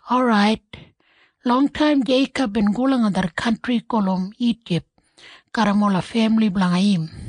Orait, longtaim Jeikob bin go langa det kantri gulum Ijip garram ola femili blanga im.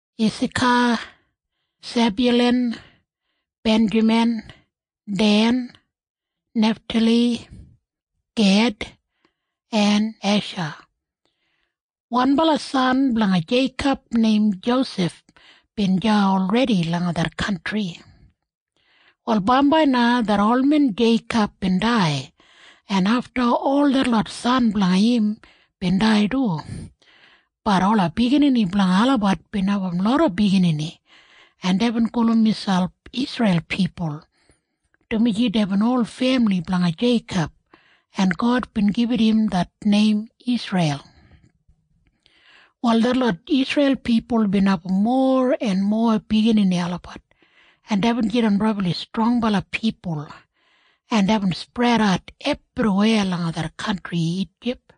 Isaka, Sebyulan, Benjamin, Den, Neftali, Ged en Esha. Wanbala san blanga Jeikob neim Josef bin deya olredi langa det kantri. Wal bambai na det olmen Jeikob bin dai, en afta ol detlot san blanga im bin dai du. Bat ola biginini blanga olabat bin abum loda biginini, en deibin gulum miselp Isreil pipul, dumaji deibin ol femili blanga Jeikob, en God bin gibit im det neim Isreil. Wal detlot Isreil pipul bin abum mowa en mowa biginini olabat, en deibin jidan brabli strongbala pipul, en deibin spredat ebriweya langa det kantri Ijip.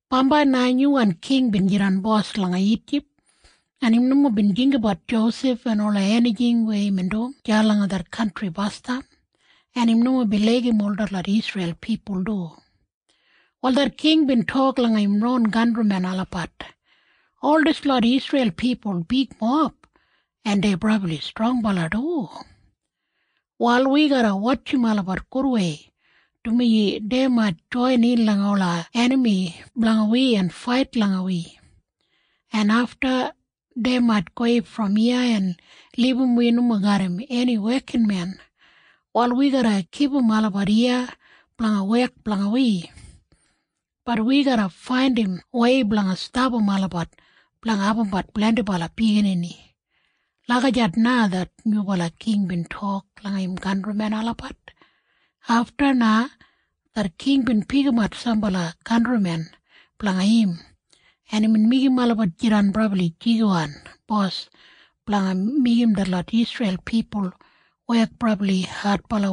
Bambai na nyuwan king bin jidan bos langa Ijip, en im nomo bin jinggabat Josef en ola enijing weya imbin dum deya langa det kantri basdam, en im nomo bin laigim ol detlot Isreil pipul du. Wal det king bin tok langa im ron kantrimen olabat, “Ol dislot Isreil pipul bigmob, en dei brabli strongbala du. Wal wi garra wotjim olabat gudwei, dumaji dei mait joinin langa ola enami blanga wi en fait langa wi, en afta dei mait gowei brom iya en libum wi nomo garram eni wekinmen. Wal wi garra kipum olabat iya blanga wek blanga wi. Bat wi garra faindim wei blanga stapam olabat blanga abumbat blendibala biginini.” Lagijat na det nyubala king bin tok langa im kantrimen olabat. Afta na det king bin pikimat sambala kantrimen blanga im, en imbin meigim olabat jidan brabli jigiwan bos blanga meigim detlot Isreil pipul wek brabli adbala,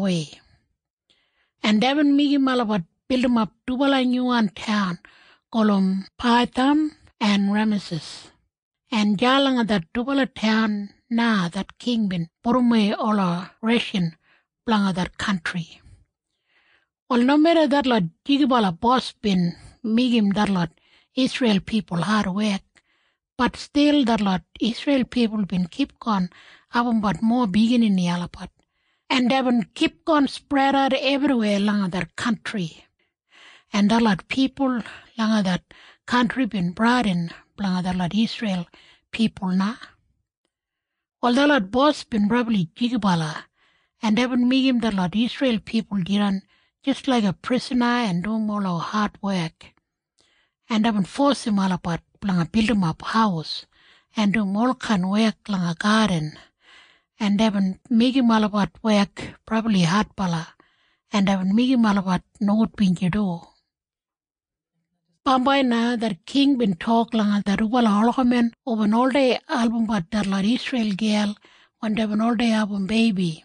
en deibin meigim olabat bildimap dubala nyuwan taun gulum Paitham en Remasis, en deya langa det dubala taun na det king bin pudumwei ola reshan blanga det kantri. Wal nomeda detlot jigibala bos bin meigim detlot Isreil pipul adwek, bat stil detlot Isreil pipul bin kipgon abumbat mowa biginini olabat, en deibin kipgon spredatbat ebriweya langa det kantri, en detlot pipul langa det kantri bin bradin blanga detlot Isreil pipul na. Wal detlot bos bin brabli jigibala, en deibin meigim detlot Isreil pipul jidan jis laiga prisana en dum ola adwek, en deibin fosim olabat blanga bildimap haus en dum olkain wek langa gadin, en deibin meigim olabat wek brabli adbala. En deibin meigim olabat nogudbinji du. Bambai na det king bin tok langa det dubala olgamen hubin oldei album detlot Isreil gel wen deibin oldei abum beibi.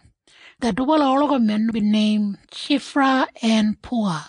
Det dubala olgamen bin neim Shifra en Puwa,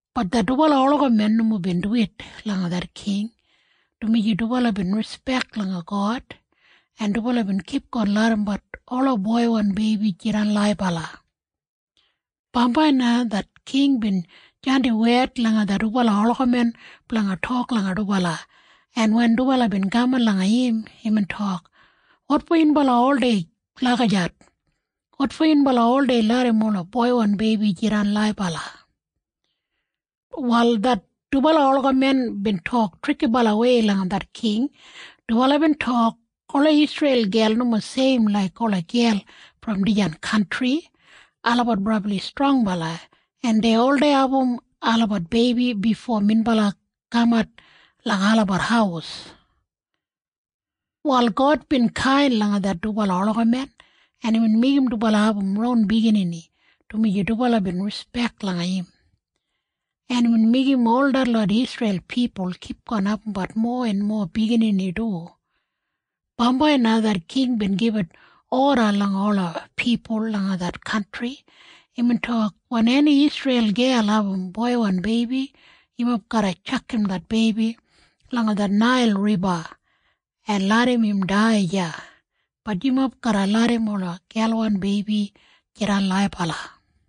Bat det dubala olgamen nomo bin duwit langa det king, dumaji dubala bin rispek langa God, en dubala bin kipgon larrambat ola boiwan beibi jidan laibala. Bambai na det king bin jandim wed langa det dubala olgamen blanga tok langa dubala, en wen dubala bin kaman langa im, imbin tok, “Wotfo yunbala oldei lagijat? Wotfo yunbala oldei larram ola boiwan beibi jidan laibala?” Wal det dubala olgamen bin tok trikibalawei langa det king. Dubala bin tok, “Ola Isreil gel nomo seim laik ola gel brom dijan kantri. Olabat brabli strongbala, en dei oldei abum olabat beibi bifo minbala kamat langa olabat haus.” Wal God bin kain langa det dubala olgamen, en imbin meigim dubala abum ron biginini, dumaji dubala bin rispek langa im. En imbin meigim ol detlot Isreil pipul kipgon abumbat mowa en mowa biginini du. Bambai na det king bin gibit oda langa ola pipul langa det kantri. Imbin tok, “Wen eni Isreil gel abum boiwan beibi, yumob garra tjakam det beibi langa det Nail Riba en larram im dai deya. Bat yumob garra larram ola gelwan beibi jidan laibala.”